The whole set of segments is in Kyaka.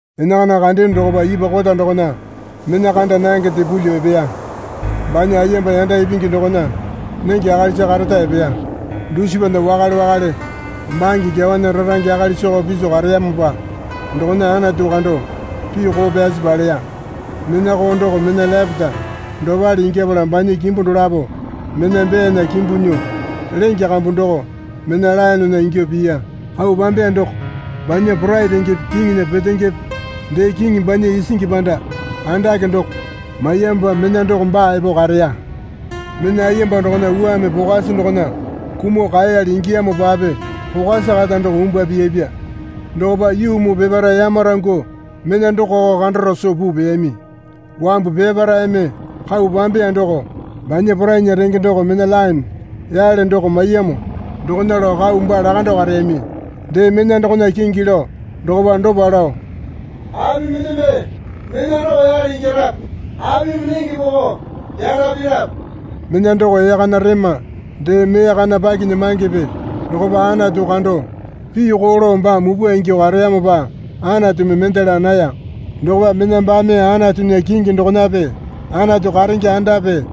Enakana kandeyono dokopa ipwa kota dokona mena kanda nangende pulyuo epeya. Banya ayemba yanda ipingi dokona nenge akalisa kareta epeya. Dusipana wakale wakale bange kyawana rarange akalisako piso kareyamopa dokona Anatu kando pii koo pyasi paleya. Mena koo doko mena lepete dopale ingyapala banya kimbu dolapo mena beyana kimbu nyuo lenge kambu doko mena laenena ingyuo piya. Kau pambeya doko banya porai rengepe kiŋinya petengepe dee kiŋi banya isingi panda andake doko maiyamopa mena doko baa epo kareya. Mena ayemba dokona wuame pokwasi dokona kumuo kaeyali ingiyamopape pokwasi kata doko umbwua piyapya. Dokopa yuu muu peparae yamarangyuo mena dokoko kandaro soo puu peyami. Wambu peparaeme kau pambeya doko banya porainya renge doko mena laene yale doko maiyamo dokona lao kau baa lakando kareyami. Dee mena dokona kingi lao dokopa dopa lao, Api mendeme mena doko yale ingyarape? Apimi nenge poko yanda pirape? Mena doko ee kana rema dee mee kana pakinyamangepe dokopa Anatu kando pii koo lao baa mupwa ingyuo kareyamopa Anatumi mende laa naya. Dokopa mena baame Anatunya kingi dokonape Anatu karenge andape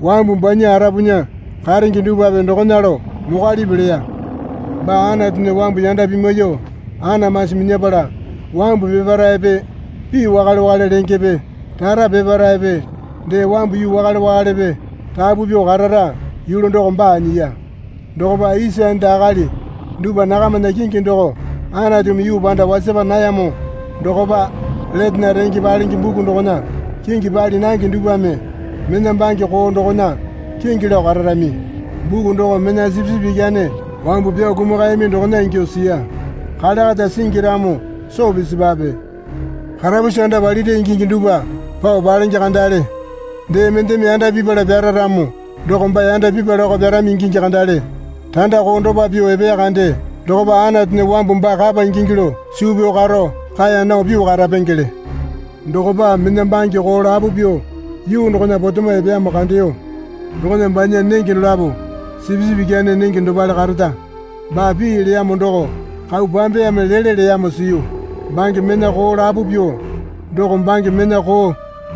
wambu banya arapunya karenge dupwape dokona lao mokwalipi leya. Baa Anatunya wambu yanda pimwaiyuo anamasi minyapala wambu peparaepe pii wakale wakale lengepe rara peparaepe dee wambu yuu wakale wakalepe rapu pyuo karara yulu doko baa nyiya. Dokopa isa enda akali dupwa nakamana kingi doko Anatumi yuu panda wasapa nayamo dokopa letena renge palenge buku dokona kingi pali nange dupwame mena bange koo dokona kingi lao kararami. Buku doko mena Sipisipi Ikyane wambu pyao kumakayami dokona ingyuo siya. Kale kata singi ramo soo pisipwape. Karapusi anda palira ingingi dupwa pao palenge kandale. Dee mendeme yanda pipala pyara ramo doko baa yanda pipalako pyarami ingingi kandale. Randa koo dopa pyuo epeya kande dokopa Anatunya wambu baa kapa ingingi lao suu pyao karo kaeya nao pyuo karapengele. Dokopa mena bange koo lapo pyuo yuu dokona potemo epeyamo kandeyo. Dokona banya nenge dolapo sipisipi ikyane nenge dopale kareta baa pii leyamo doko kau pambeyame lele leyamo siyu. Bange mena koo lapo pyuo doko bange mena koo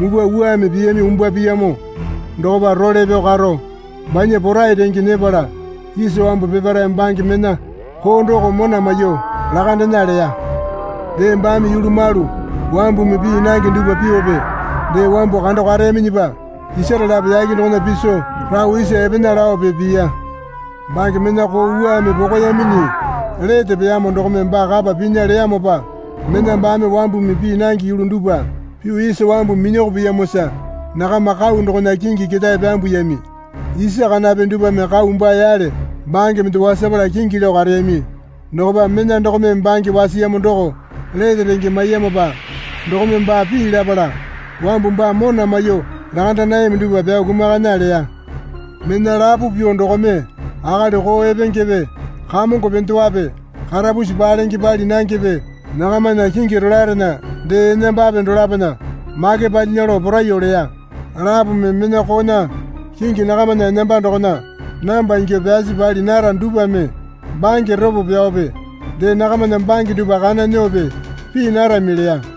mupwa wuame piyami umbwua piyamo dokopa role pyao karo banya porai renge nyepala isa wambu peparae bange mena koo doko mona maiyuo lakandena leya. Dee baame yulu malu wambumi pii nange dupwa pyuope dee wambu kando kareyaminyipa isare lapo yake dokona piso rao isa epena laope piya. Bange mena koo wuame pokoyaminyi lete peyamo dokome baa kapa pinya leyamopa mena baame wambumi pii nange yulu dupwa pyuo isa wambu minyoko piyamosa nakama kau dokona kingi ketae pyambuyami isa kanape dupwame kau baa yale bange mende wasapala kingi lao kareyami. Dokopa mena dokome bange wasiyamo doko lete renge maiyamopa dokome baa pii lapala wambu baa mona maiyuo lakanda nayami dupwa pyao kumakana leya. Mena lapo pyuo dokome akali koo epengepe kamongo pendewape karapusi palenge pali nangepe nakamana kingi rolaerena dee enambape dolapona make palyinya lao poraiyuo leya. Lapome mena koona kingi nakamana enamba dokona namba ingyuo pyasi pali nara dupwame bange ropo pyaope dee nakamana bange dupwa kana nyuope pii narami leya.